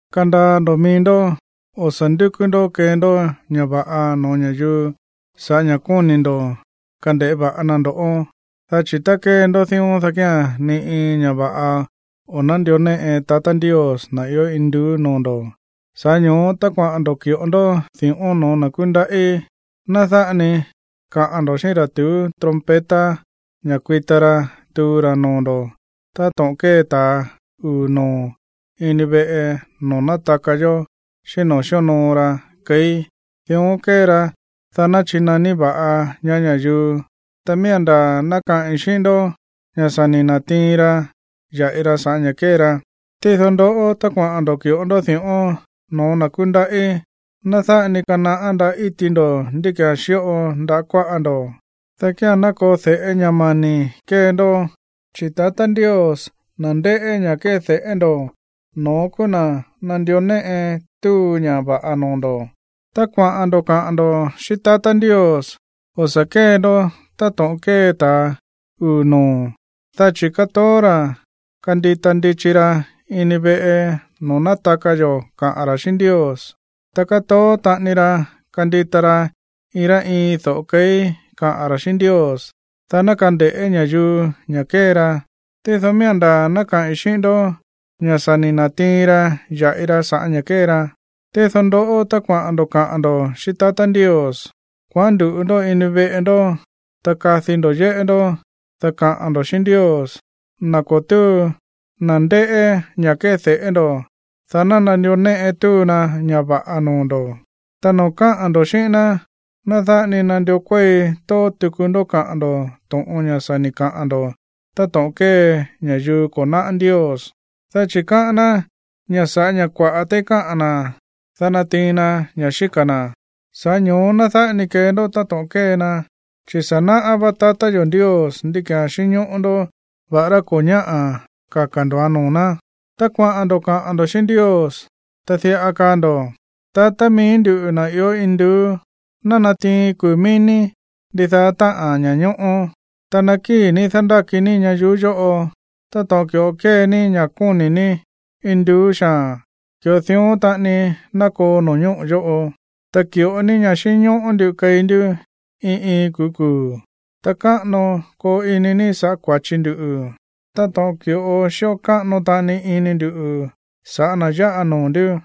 ’Kandaa ndo̱ mií ndó, o̱ sa̱ ndúkú ndó kee ndó ña̱ va̱ꞌa no̱ó ña̱yuu sa̱ꞌá ña̱ kóni̱ ndo̱ kande̱ꞌé va̱ꞌa na ndo̱. Dá chi̱ tá kée ndó dión, dá kía̱n ni iin ña̱ va̱ꞌa o̱ nándió néꞌe tatá Ndios, na̱ ió induú, noo̱ ndo̱. Sa̱ꞌá ño̱ó, tá kuaꞌa̱n ndo̱ ki̱ꞌo ndó di̱ꞌón no̱ó na̱ kúndaꞌí, ná dáꞌa ni kaꞌa̱n ndo̱ xíꞌín ra̱ tuú trompeta ña̱ kuita ra tuu ra noo̱ ndo̱ táto̱ꞌon kée ta̱a uu̱ noo̱ ini veꞌe noo̱ nátaka yo̱ xíꞌín noo̱ xíonoo ra keí. Dión kée ra, dá ná chinaní va̱ꞌa ñaá ña̱yuu. Ta miía̱n ndaa̱ ná kaꞌi̱n xíꞌín ndó ña̱ sa̱ ni̱ na̱tiin ra ya̱ꞌi ra sa̱ꞌá ña̱ kée ra. Tído, ndoꞌó, tá kuaꞌa̱n ndo̱ ki̱ꞌo ndó di̱ꞌón no̱ó na̱ kúndaꞌí, ná dáꞌa ni kanaꞌá ndaꞌá íti ndo̱ ndí ki̱án xíꞌo ndaꞌá kuáꞌa ndo̱, dá kía̱n ná koo de̱ꞌé ña̱ mani̱ kée ndó, chi̱ tatá Ndios, na̱ ndéꞌé ña̱ kéde̱ꞌé ndo̱, no̱ón kúú na̱ nandió néꞌe túu ña̱ va̱ꞌa noo̱ ndo̱. ’Tá kuaꞌa̱n ndo̱ kaꞌa̱n ndo̱ xíꞌín tatá Ndios, o̱ sa̱ kée ndó táto̱ꞌon kée ta̱a uu̱ noo̱, dá chi̱ kátoó ra̱ kandita ndichi ra̱ ini veꞌe noo̱ nátaka yo̱ kaꞌa̱n ra̱ xíꞌín Ndios, ta kátoó taꞌani ra kandita ra iin rá iin do̱ꞌo keí kaꞌa̱n ra̱ xíꞌín Ndios, dá ná kande̱ꞌé ña̱yuu ña̱ kée ra. Tído miía̱n ndaa̱ ná kaꞌi̱n xíꞌín ndó ña̱ sa̱ ni̱ na̱tiin ra ya̱ꞌi ra sa̱ꞌá ña̱ kée ra. Tído ndoꞌó, tá kuaꞌa̱n ndo̱ kaꞌa̱n ndo̱ xíꞌín tatá Ndios, kuaꞌán ndu̱ꞌu ndó ini veꞌe ndó, ta kadi ndo̱ yéꞌé ndó, dá kaꞌa̱n ndo̱ xíꞌín Ndios, na̱ ko̱ túu, na̱ ndéꞌé ña̱ kéde̱ꞌé ndo̱, dá ná nandió néꞌe túu na ña̱ va̱ꞌa noo̱ ndo̱. ’Ta noo̱ káꞌa̱n ndo̱ xíꞌín ná, ná dáꞌa ni nandió kuéi tóó tuku ndó kaꞌa̱n ndo̱ to̱ꞌon, ña̱ sa̱ ni̱ kaꞌa̱n ndo̱ táto̱ꞌon kée ña̱yuu ko̱ náꞌá Ndios, dá chi̱ káꞌán ná ña̱ sa̱ꞌá ña̱ kua̱ꞌá téí káꞌa̱n na̱, dá natiin na ña̱ xíka̱ na̱. Sa̱ꞌá ño̱ó ná dáꞌa ni kee ndó táto̱ꞌon kée na, chi̱ sa̱ naꞌá vá tatá yo̱ Ndios ndí ki̱án xínñóꞌó ndó va̱ꞌará ko̱ ñáꞌa̱ kaka̱ ndo̱án noo̱ ná. Tá kuaꞌa̱n ndo̱ kaꞌa̱n ndo̱ xíꞌín Ndios, ta diꞌa kaa ndo̱: Tatá mií nduꞌu̱, na̱ ió induú, ná natiin kuu̱ mií ní ndidaá táꞌa̱n ña̱ñóꞌó. Ta ná kii ní dándáki ní ñayuú yóꞌo. Táto̱ꞌon ki̱ꞌo kée ní ña̱ kóni̱ ní induú xaa̱n, ki̱ꞌo dión taꞌani ná koo no̱ñóꞌo̱ yóꞌo. Ta ki̱ꞌo ní ña̱ xínñóꞌó nduꞌu̱ keí ndú iin iin kuu̱ kuu̱. Ta káꞌano koo ini ní sa̱ꞌá kua̱chi ndu̱ táto̱ꞌon ki̱ꞌo xíꞌo káꞌano taꞌani ini ndu̱ sa̱ꞌá na̱ yáꞌa noo̱ ndú.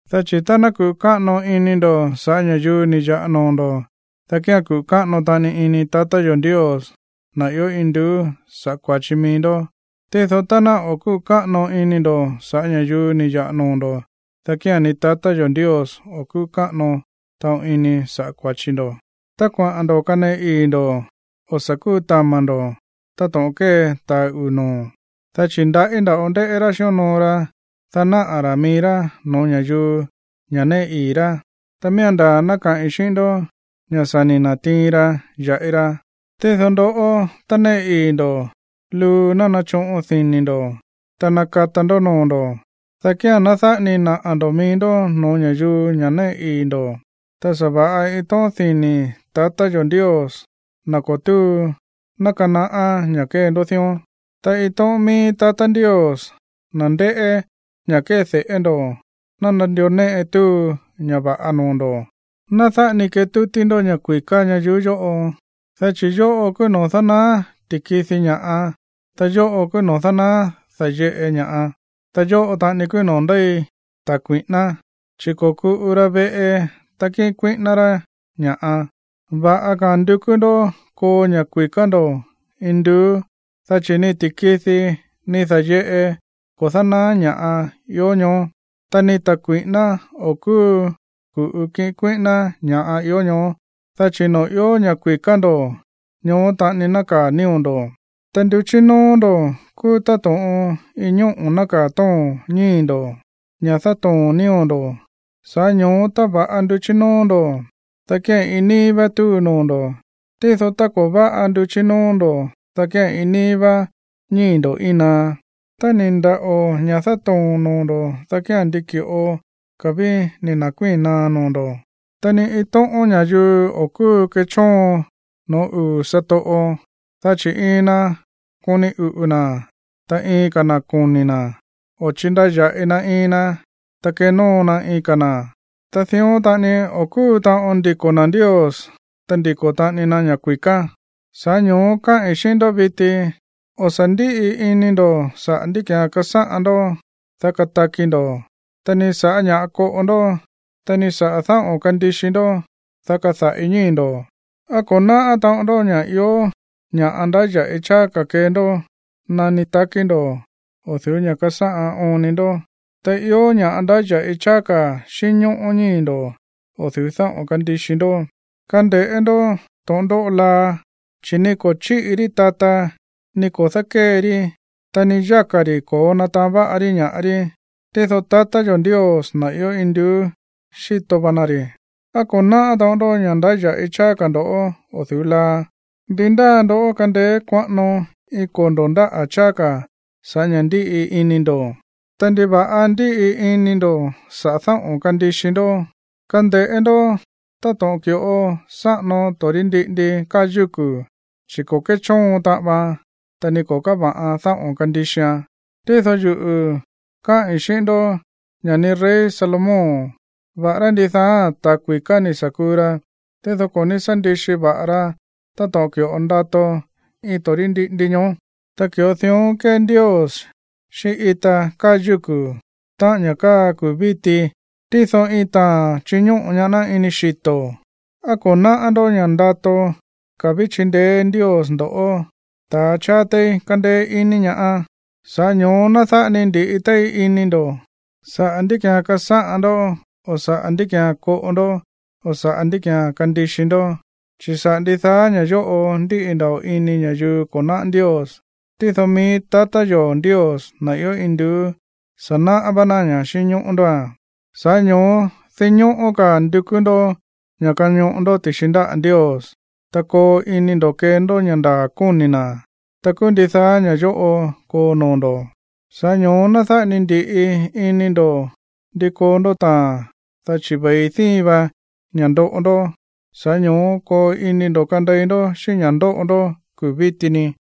’Dá chi̱ tá ná kuꞌu̱ káꞌano ini ndo̱ sa̱ꞌá ña̱yuu ni̱ ya̱ꞌa noo̱ ndo̱, dá kía̱n kuꞌu̱ káꞌano taꞌani ini tatá yo̱ Ndios, na̱ ió induú, sa̱ꞌá kua̱chi mií ndó. Tído tá ná o̱ kúꞌu̱ káꞌano ini ndo̱ sa̱ꞌá ña̱yuu ni̱ ya̱ꞌa noo̱ ndo̱, dá kía̱n ni tatá yo̱ Ndios o̱ kúꞌu̱ káꞌano taꞌon ini sa̱ꞌá kua̱chi ndo̱. ’Tá kuaꞌa̱n ndo̱ kaneꞌe ii̱ ndo̱, o̱ sa̱ kútama̱ ndo̱ táto̱ꞌon kée ta̱a uu̱ noo̱, dá chi̱ ndaꞌí nda̱ꞌo ndéꞌé rá xíonoo ra, dá náꞌa̱ ra̱ mií rá no̱ó ña̱yuu ña̱ néꞌe ii̱ rá. Ta miía̱n ndaa̱ ná kaꞌi̱n xíꞌín ndó ña̱ sa̱ ni̱ na̱tiin ra ya̱ꞌi ra. Tído ndoꞌó, tá néꞌe ii̱ ndo̱, luu ná nachoꞌon dini̱ ndo̱, ta nakata ndó noo̱ ndo̱, dá kía̱n ná dáꞌa ni naꞌa̱ ndo̱ mií ndó no̱ó ña̱yuu ña̱ néꞌe ii̱ ndo̱. Ta sa̱va̱ꞌa iin tóꞌón dini̱ tatá yo̱ Ndios, na̱ ko̱ túu, ná kanaꞌá ña̱ kée ndó dión. Ta iin tóꞌón mií tatá Ndios, na̱ ndéꞌé ña̱ kéde̱ꞌé ndo̱, ná nandió néꞌe túu ña̱ va̱ꞌa noo̱ ndo̱. ’Ná dáꞌa ni ketútí ndó ña̱ kui̱ká ñayuú yóꞌo, dá chi̱ yóꞌo kúú noo̱ dánaá ti̱kidi ña̱ꞌa, ta yóꞌo kúú noo̱ dánaá da̱yeꞌe ña̱ꞌa, ta yóꞌo taꞌani kúú noo̱ ndéi ta̱ kui̱ꞌíná, chi̱ ko̱kuꞌu ra veꞌe, ta kíꞌin kuíꞌíná rá ña̱ꞌa. Va̱ꞌa ka̱a̱n ndukú ndó koo ña̱ kui̱ká ndo̱ induú, dá chi̱ ni ti̱kidi, ni da̱yeꞌe ko̱ dánaá ña̱ꞌa ió ñoó, ta ni ta̱ kui̱ꞌíná o̱ kúu ku̱ꞌu kiꞌin kuíꞌíná ña̱ ió ñoó. Dá chi̱ noo̱ ió ña̱ kui̱ká ndo̱, ñoó taꞌani nákaa̱ nío̱ ndo̱. ’Ta nduchí nóó ndo̱ kúú táto̱ꞌon iin ñóꞌo̱ nákaa̱ tóo̱n ñíi̱ ndo̱, ña̱ dátoo̱n nío̱ ndo̱. Sa̱ꞌá ño̱ó tá va̱ꞌa nduchí nóó ndo̱, dá kía̱n iin níí vá túu noo̱ ndo̱. Tído tá ko̱ váꞌa nduchí nóó ndo̱, dá kía̱n iin níí vá ñíi̱ ndo̱ íin naá. Tá ni̱ ndaꞌo̱ ña̱ dátoo̱n noo̱ ndo̱, dá kía̱n ndi ki̱ꞌo ka̱ ví ni̱ na̱kuíi̱n naá noo̱ ndo̱. ’Ta ni iin tóꞌón ña̱yuu o̱ kúu kéchóon no̱ó uu̱ satoꞌo, dá chi̱ iin na koni uꞌu̱ na̱, ta iin ka̱ na̱ koni̱ na̱, o chindaya̱ꞌi na iin na, ta kenóo na iin ka̱ na̱. Ta dión taꞌani o̱ kúu taꞌon ndiko̱ na̱ Ndios, ta ndiko̱ taꞌani na ña̱ kui̱ká. ’Sa̱ꞌá ño̱ó káꞌi̱n xíꞌín ndó viti, o̱ sa̱ ndíꞌi ini ndo̱ saꞌa̱ ndí ki̱án kasáꞌan ndó, dá kataki ndo̱, ta ni sa̱ꞌá ña̱ koꞌo ndó, ta ni saꞌa̱ dáꞌo̱n kandixi ndó, dá kada̱ꞌi ñíi̱ ndo̱. ¿Á ko̱ náꞌá taꞌon ndó ña̱ ió ña̱ꞌa ndáya̱ꞌi cháá ka̱ kee ndó nani takí ndo̱ o̱ du̱ú ña̱ kasáꞌan oon ni ndó? Ta ió ña̱ꞌa ndáya̱ꞌi cháá ka̱ xínñóꞌó ñíi̱ ndo̱ o̱ du̱ú dáꞌo̱n kandixi ndó. Kande̱ꞌé ndó to̱ꞌon ndóꞌo laa, chi̱ ni ko̱ chíꞌi rí tata, ni ko̱ dákée rí, ta ni yáka̱ ri̱ ko̱ó nátaán va̱ꞌa rí ña̱ꞌa rí. Tído tatá yo̱ Ndios, na̱ ió induú, xíto va na ri̱. ¿Á ko̱ náꞌá taꞌon ndó ña̱ ndáya̱ꞌi cháá ka̱ ndo̱ o̱ du̱ú laa? ¿Ndi ndáa ndó kandeé kuaꞌano iin kondo̱ ndáꞌa̱ cháá ka̱ sa̱ꞌá ña̱ ndíꞌi ini ndo̱? ’Ta, ¿ndiva̱ꞌa ndíꞌi ini ndo̱ saꞌa̱ dáꞌo̱n kandixi ndó? Kande̱ꞌé ndó táto̱ꞌon ki̱ꞌo sáꞌano torí ndiꞌindi káa yúku̱, chi̱ ko̱ kéchóon taꞌan vaan, ta ni ko̱ káva̱ꞌan dáꞌo̱n kandixian. Tído yuꞌu̱ káꞌi̱n xíꞌín ndó ña̱ ni rey Salomón, va̱ꞌará ndidaa ta̱ kui̱ká ni̱ sa̱ kuu ra, tído ko̱ ní sá ndixi va̱ꞌa ra táto̱ꞌon ki̱ꞌo ndato iin torí ndiꞌindi ñoó. Tá ki̱ꞌo dión kée Ndios xíꞌín ita káa yúku̱, táꞌa̱n ña̱ káa kuu̱ víti, tído iin taa̱n chiñóꞌo̱ ñaá ná ini xito̱, ¿á ko̱ náꞌá ndó ña̱ ndato ka̱ ví chindeé Ndios ndo̱ꞌó, ta̱ cháá téí kándéé ini ñaá? Sa̱ꞌá ño̱ó ná dáꞌa ni ndi̱ꞌi téí ini ndo̱ saꞌa̱ ndí ki̱án kasáꞌan ndó o̱ saꞌa̱ ndí ki̱án koꞌo ndó o̱ saꞌa̱ ndí ki̱án kandixi ndó, chi̱ saꞌa̱ ndidaá ña̱ yóꞌo ndíꞌi nda̱ꞌo ini ña̱yuu ko̱ náꞌá Ndios. Tído mií tatá yo̱ Ndios, na̱ ió induú, sa̱ náꞌá vá ná ña̱ xínñóꞌó ndóa̱n. Sa̱ꞌá ño̱ó dinñóꞌó ka̱ ndukú ndó ña̱ kañoꞌo ndó ti̱xi ndáꞌa̱ Ndios, ta koo ini ndo̱ kee ndó ña̱ ndaa̱ kóni̱ na̱, ta kúú ndidaá ña̱ꞌa yóꞌo koo noo̱ ndo̱. Sa̱ꞌá ño̱ó ná dáꞌa ni ndi̱ꞌi ini ndo̱ ndi koo ndó taa̱n, dá chi̱ ve̱i díin va ña̱ꞌa ndoꞌo ndó. Sa̱ꞌá ño̱ó koo ini ndo̱ kandei ndó xíꞌín ña̱ ndóꞌo kuu̱ víti ni.